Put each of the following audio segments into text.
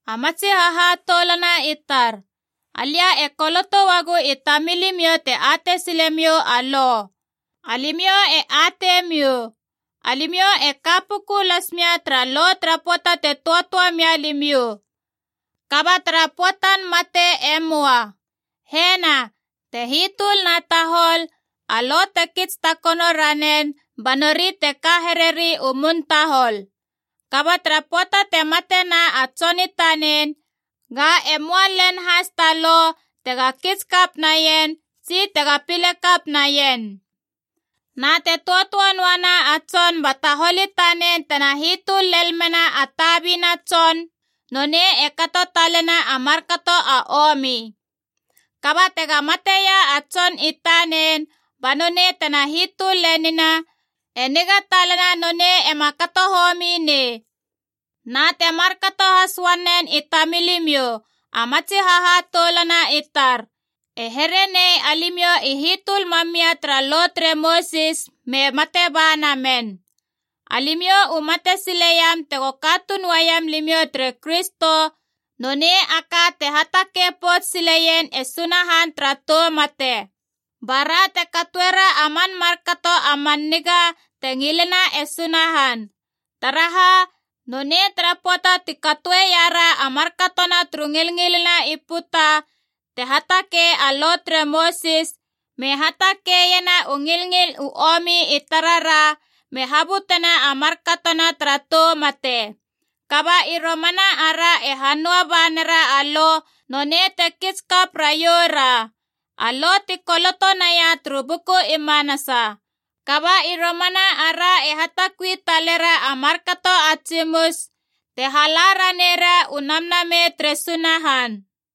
A matsi hahatoulana i tar, alia e koloto uagu i tamilimiou te atei silemiou a lo. Alimiou e atei miou, alimiou e ka puku las mia tara lo tara pöata te töatöa mia limiou. Kaba tara pöatan mate e möa. Hena, te hitöl na tahol, a lo te kits takono ranen ba nori te ka hereri u mun tahol. Kaba tara pöata te matena a tson i tanen, ga e möa len has ta lo tega kits kap naien tsi tega pilekap naien. Na te töatöa noana a tson ba tahol i tanen tena hitöl lel mena a tabina tson, nonei e kato talena a markato a omi. Kaba tega mateia a tson i tanen, ba nonei tena hitöl lenina, e niga talana nonei ema kato homi nei. Na te markato has uanen i tamilimiou, a matsi hahatoulana i tar. E here nei alimiou i hitöl mam mia tara Lo tere Mosis me mate ba namen. Alimiou u mate sileiam tego katuun uaiam limiou tere Kristo, nonei a ka te hatakei pouts sileien e Sunahan tara tou mate. Bara te katoera a man markato a man niga te ngilena e Sunahan. Taraha, nonei tara pöata ti katoeiara a markatona turu ngilngilina i puta te hatakei a Lo tere Mosis, me hatakeiena u ngilngil u omi i tarara, me habutena a markatona tara tou mate. Kaba i romana ara e hanöa ba nera a Lo, nonei te kits kap raioura. A Lo ti koloto naia turu buku i manasa. Kaba i romana ara e hatakui talera a markato a tsimus, te hala ranera u Namnamei tere Sunahan.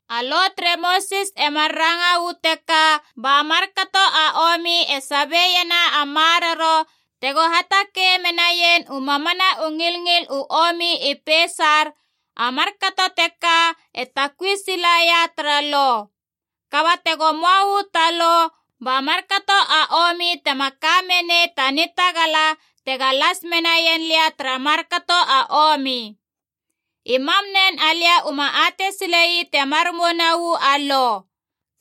A Lo tere Mosis e mar ranga uu teka ba markato a omi e sabiena a maroro tego hatakei menaien u mamana u ngilngil u omi i peisar, a markato teka e takui silaia tara Lo. Kaba tego möa uu ta Lo, ba markato a omi tema ka menei ta nitagala tega las menaien lia tara markato a omi. I mam nen alia uma atei sile ii temar mouna uu a Lo.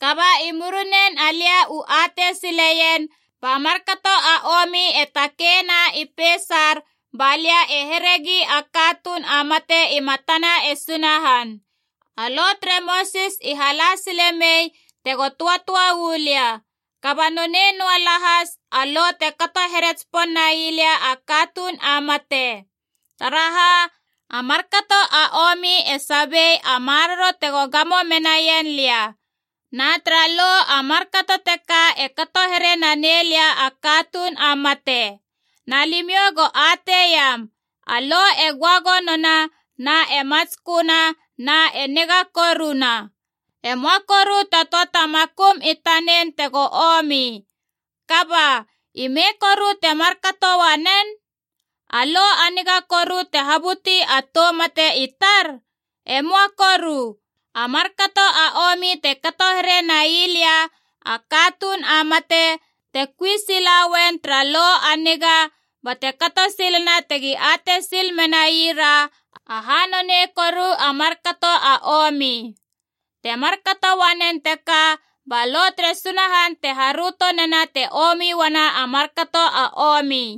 Kaba i murinen alia u atei sileien, ba markato a omi e takeina i peisar ba lia e heregi a katuun a mate i matana e Sunahan. A Lo tere Mosis i hala sile mei tego töatöa u lia. Kaba nonei noa lahas a Lo te kato here tsipon nai lia a katuun a mate. Taraha, a markato a omi e sabie a maroro tego gamo menaien lia. Na tara Lo a markato teka e kato here na nei lia a katuun a mate. Na limiou go atei iam, a Lo e göagonona na e matsköna na e niga koruna. E möa koru ta töa ta makum i tanen tego omi. Kaba, ime koru te markato uanen? A Lo a niga koru te habuti a tou mate i tar? Emoa koru! A markato a omi te kato here nai lia a katuun a mate, te kui sila uen tara Lo a niga, bate kato silena tegi atei sil menaira aha nonei koru a markato a omi. Te markato uanen teka ba Lo tere Sunahan te haröto nena te omi uana a markato a omi.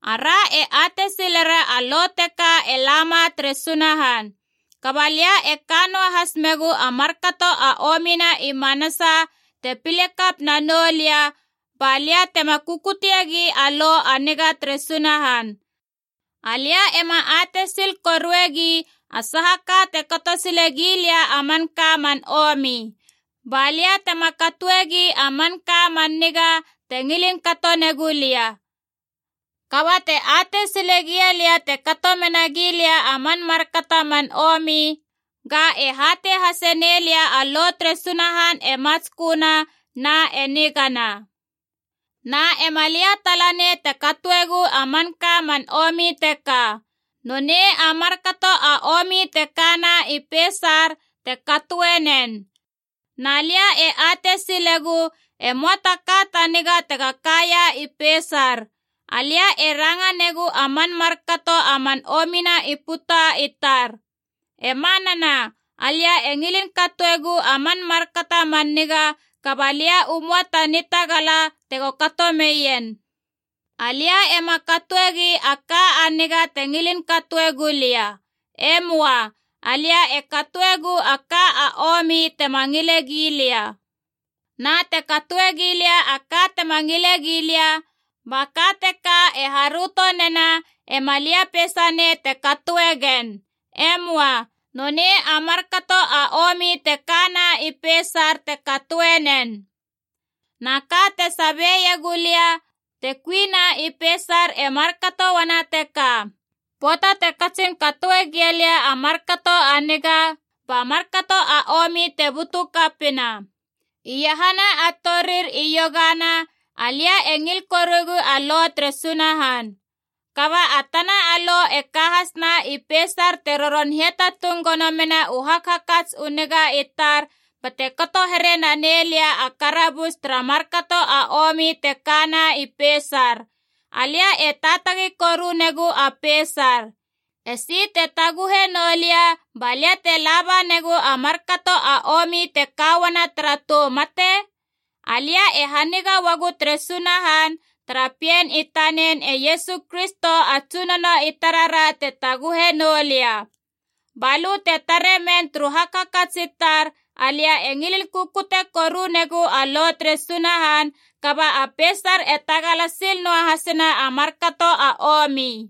Ara e atei silera a Lo teka e lama tere Sunahan. Kaba lia e ka noahas megu a markato a omina i manasa te pilekap nanou lia, ba lia tema kukuteiegi a Lo a niga tere Sunahan. Alia ema atei sil koruegi a saha ka te kato silegi lia a manka man omi. Ba lia tema katoegi a manka a man niga te ngilin kato negu lia. Kaba te atei sile gia lia te kato menagi lia a man markato a man omi, ga, e hatei hase nelia a Lo tere Sunahan e matsköna na e nigana. Na ema lia talanei te katoegu a manka a man omi teka. Nonei a markato a omi te kana i peisar te katoe nen. Na lia e atei silegu e möa ta ka ta niga tega kaia i peisar. Alia e ranga negu a man markato a man omina i puta i tar. E manana, alia e ngilin katoegu a man markato a man niga, kaba lia u möa ta nitagala tego kato meien. Alia ema katoegi a ka a niga te ngilin katoe gulia. E möa. Alia e katoegu a ka a omi tema ngile gilia. Na te katoe gilia a ka tema ngile gilia, ba ka teka e haröto nena ema lia peisa nei te katoe gen. E möa. Nonei a markato a omi te kana i peisar te katoe nen. Na ka te sabeiegu lia te kuina i peisar e markato uana teka: pöata te katsin katoe gia lia a markato a niga, ba markato a omi te butu kapina. Iahana a torir iogana alia e ngil koruegu a Lo tere Sunahan. Kaba a tana lo e ka hasna i peisar te roron hiatatung gono mena u hakhakats u niga i tar bate kato here nanei lia a karabus tara markato a omi te kana i peisar. Alia e taatagi koru negu a peisar. Esi te taguhe nou lia ba lia te laba negu a markato a omi te ka uana tara tou mate? Alia e haniga uagu tere Sunahan, tara pien i tanen e Iesu Kristo a Tsunono i tarara te taguhe noulia. Ba lö te tare men turu hakhakats i tar alia e ngilin kukute korunegu a Lo tere Sunahan, kaba a peisar e tagala sil noa hasena a markato a omi.